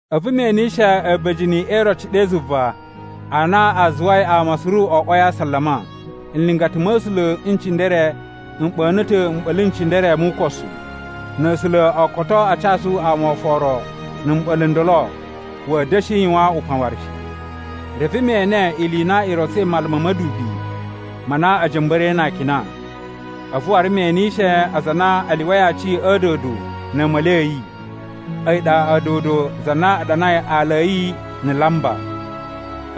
A̱vu me enishe a̱ba̱jini e iroci ɗe zuva a na a zuwai ama suru o oꞌwoi a asalama. Nlingata ma̱ A̱sula̱ n cindere m ɓa̱na̱ ta̱ mɓa̱la̱ n cindere mu ukosu. Na̱ A̱sula̱ o koto a casu ama oforo na̱ mɓa̱la̱ n ndolo, wa̱a̱ da̱shi yuwan upan waru shi. Reve me ene ili i na i rotsoi mala ma̱ ma̱dubi ma na a̱ ja̱mba̱ra̱i na akina. A̱vu waru me enishe aza a na a lyuwai aci a̱ a̱a̱dodo na̱ a̱a̱ma̱li a̱ yi, a̱yi ɗa a̱a̱dodo za na a ɗanai aala a̱ yi na̱ laamba.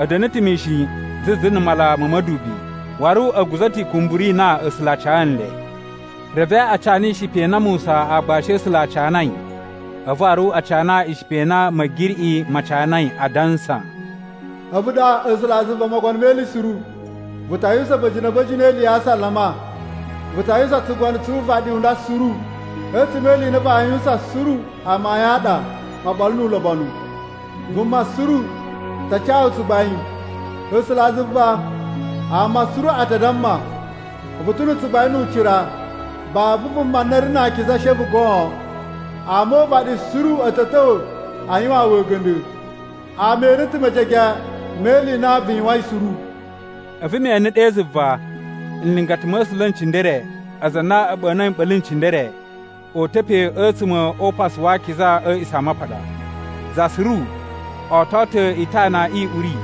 A̱ da̱na̱ ta̱ mishin zuzu na̱ mala ma̱ ma̱dubi, waru a̱ guza̱ ta̱ ikumburu i na A̱sula̱ a ca nle. Reve a cana ishipa i na Musa aagbashi a̱ A̱sula̱ a canai a̱vu waru a cana ishipa i na Ma̱giriꞌi ma canai, adansa, “A̱vu ɗa A̱sulazuva Mogono me Ili Suru, vu ta yuwusan a̱ba̱jini a̱ba̱jini e ili ya asalama. Vu ta yuwusan tsugono tsu uvaɗi u nda suru. A̱tsuma̱ e ili i na vaa yuwusan suru amayun a ɗa oɓolo nu ulobonu. Vuma suru ta ca wu tsugbain, A̱sulazuva! Ama suru a ta damma, ‘Vu ta̱ na̱ tsugbain nu ucira. Babu vuma na ri na akiza, she a̱vu goon. Ama o uvaɗi suru a̱ ta̱ ta̱wa̱ a yuwaan wu a̱ga̱nda̱. Ama ene ta̱ mejege me ili i na vu yuwain suru.’” A̱vu me ene ɗe zuva, nlingata ma̱ A̱sula̱ n cindere aza a na a̱ ɓa̱na̱i mɓa̱la̱ n cindere o uta̱ pe a̱tsuma̱ o Upasu wa Akiza a̱ A̱a̱ꞌisamapaɗa. Za suru oto ta̱ itana i uri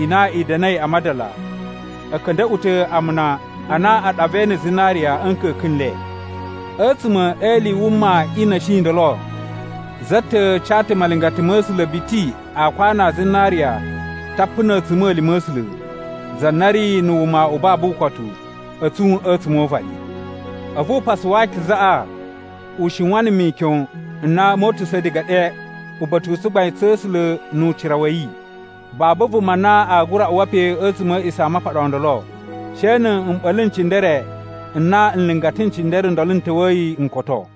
i na i da̱na̱i a madala, a̱ ka̱nda̱ꞌwa̱ ta̱ amuna a na a ɗavai na̱ zinariya a̱ nka̱ka̱n n le. A̱tsuma̱ e ili i wuma i na̱shi i ndolo za ta̱ ca ta̱ malingata ma̱ A̱sula̱ biti aakwanu a zinariya tapu na̱ a̱tsuma̱lima̱ a̱ A̱sula̱, za na ri na̱ wuma u babu ukotu, a̱ tsun a̱tsuma̱ o uvaɗi. A̱vu Upasu wa Akizaꞌa u shiwan na̱ mikyon n na moo utusa̱ diga ɗe uba̱ta̱ u tsugbain tsa̱ A̱sula̱ nu ucira wa̱ yi. Babu vuma na aa gura uwa pe a̱tsuma̱ a̱ A̱a̱ꞌisamapaɗa o ndolo she na̱ mɓa̱la̱ n cindere n na nlingata n cindere n ndolo n ta̱wa̱yi n koto.